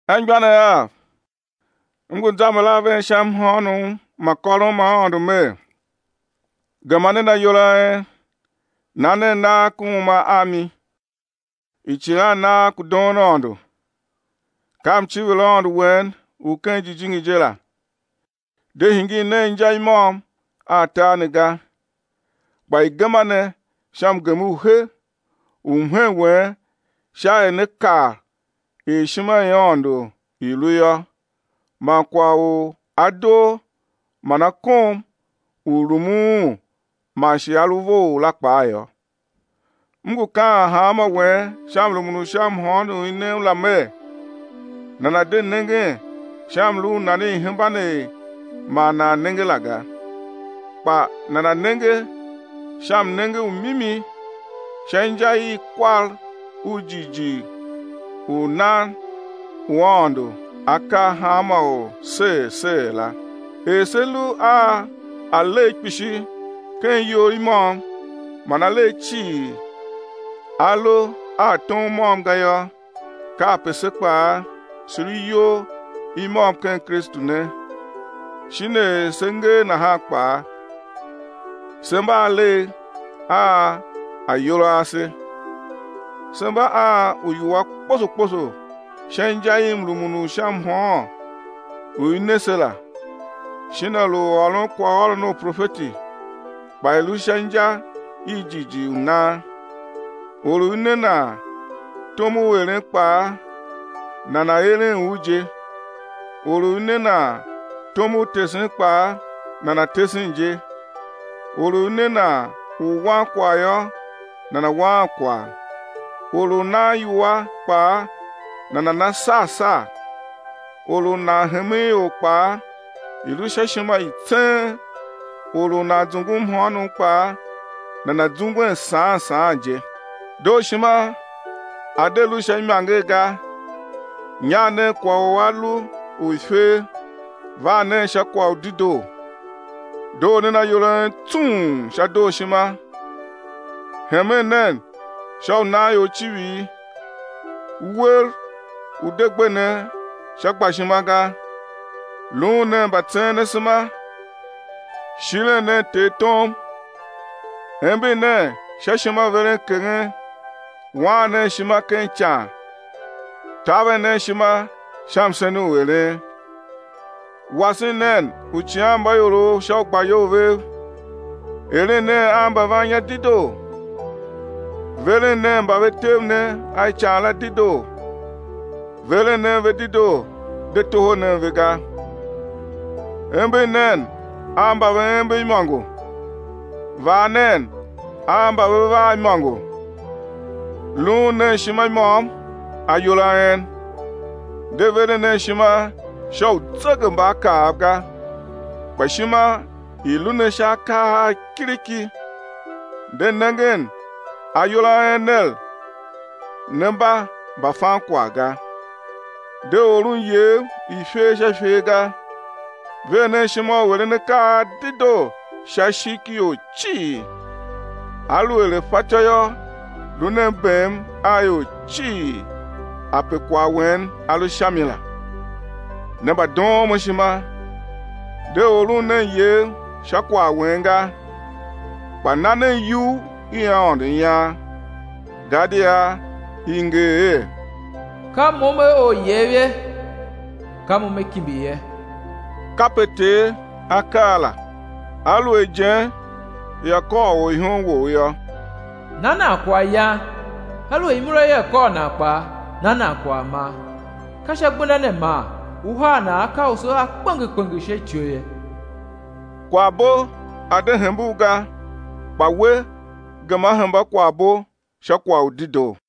Anmgbianev av, m ngu zamber a ven sha mhôônom ma kôron ma Aôndo mer, gema nen ayol a en na nen nagh ku uma a mi, icighannagh ku doon Aôndo, ka mciviraôndo wen u ken jijingi je la. De hingir nen inja i môm a tar ne ga, kpa i̱ gema ne sha mgem u he u mhen wen sha er né kav er ishima i Aôndo i lu yô man kwagh u a doo man a kom u rumun un man shi a lu vough la kpaa yô. M ngu kaan hanmô wen sha mrumun u sha mhôôn u i nem la mer, nana̱ de nengen sha mlu u nan i̱ hemban er ma nan nenge la ga, kpa nana̱ nenge sha mnenge u mimi, sha inja i kwar u jighjigh u nan u Aôndo A kar hanma or ser ser la. Er se lu a alegh kpishi ken iyol i môm man alegh cii a lu a tom môm ga yô, kape se kpaa, se lu iyol i môm ken Kristu ne, shin er se ngee nahan kpaa, se mba alegh a ayol a ase. Se mba a uiwua kposo kposo sha inja i mrumun u sha mhôôn u i ne se la, shin a lu u ôron kwaghôron u profeti, kpa i̱ lu sha inja i jighjigh u nan; or u i ne nan tom u eren kpaa, nana̱ eren u je; or u i ne nan tom u tesen kpaa, nana̱ tesen je; or u i ne nan u wan kwagh yô, nana̱ waan kwagh; or u nan iwua kpaa, nana̱ na sar sar; or u nan hemen ior kpaa i̱ lu sha ishima i tseen; or u nan zungu mhôônom kpaa nana̱ zungwen saan saan je. Dooshima a̱ de lu sha imanger ga, nyagh nen kwagh u a lu u ifer, var nen sha kwagh u dedoo. Doo nen ayol a en tsung sha dooshima, hemen nen sha u nan ior icivir. Uwer u̱ de gbe ne sha gbashima ga, luun nen mbatseen asema, shiren nen Ter tom. Ember nen sha ishimaverenkeghen, waan nen ishima ken ican, taver nen ishima sha msen u eren. Wasen nen uicighanmbaiorov sha ugbayol vev, eren nen a mbavannya dedoo. Veren nen mba ve tev ne a ican la dedoo. Veren nen ve dedoo de toho nen ve ga. Ember nen a mba ve ember imôngo. Vaa nen a mba ve vaa imôngo. Luun nen ishima i môm ayol a en, de veren nen ishima sha uzegembaakaav ga kpa ishima i̱ lu ne sha akaa a kiriki, de nengen ayol a en ner ne mba mbafankwagh ga. De oron iyev i ifer sha ifer ga. Ver nen ishima u eren akaa a dedoo sha ishigh ki ior cii. Aluer a fatyô yô, lu nen bem a ior cii ape kwagh wen a lu sha mi la. Ne mbadoon mo ishima, de oron nen iyev sha kwagh wen ga, kpa na nen iyugh i Aôndo ian, gadia i nger er: Ka Mo Me or iyev ye, ka Mo Me kimbi ye, kape Ter A kaa la. Aluer ijen ia kôr orihom wou yô, na nan kwaghyan, aluer imura ia kôr nan kpaa na nan kwaghman, ka sha gbenda ne man ú haa nan akausu a kpenger kpenger sha ityou ye. Kwaghbo a̱ de hembe u ga, kpa we gema hemba kwaghbo sha kwagh u dedoo.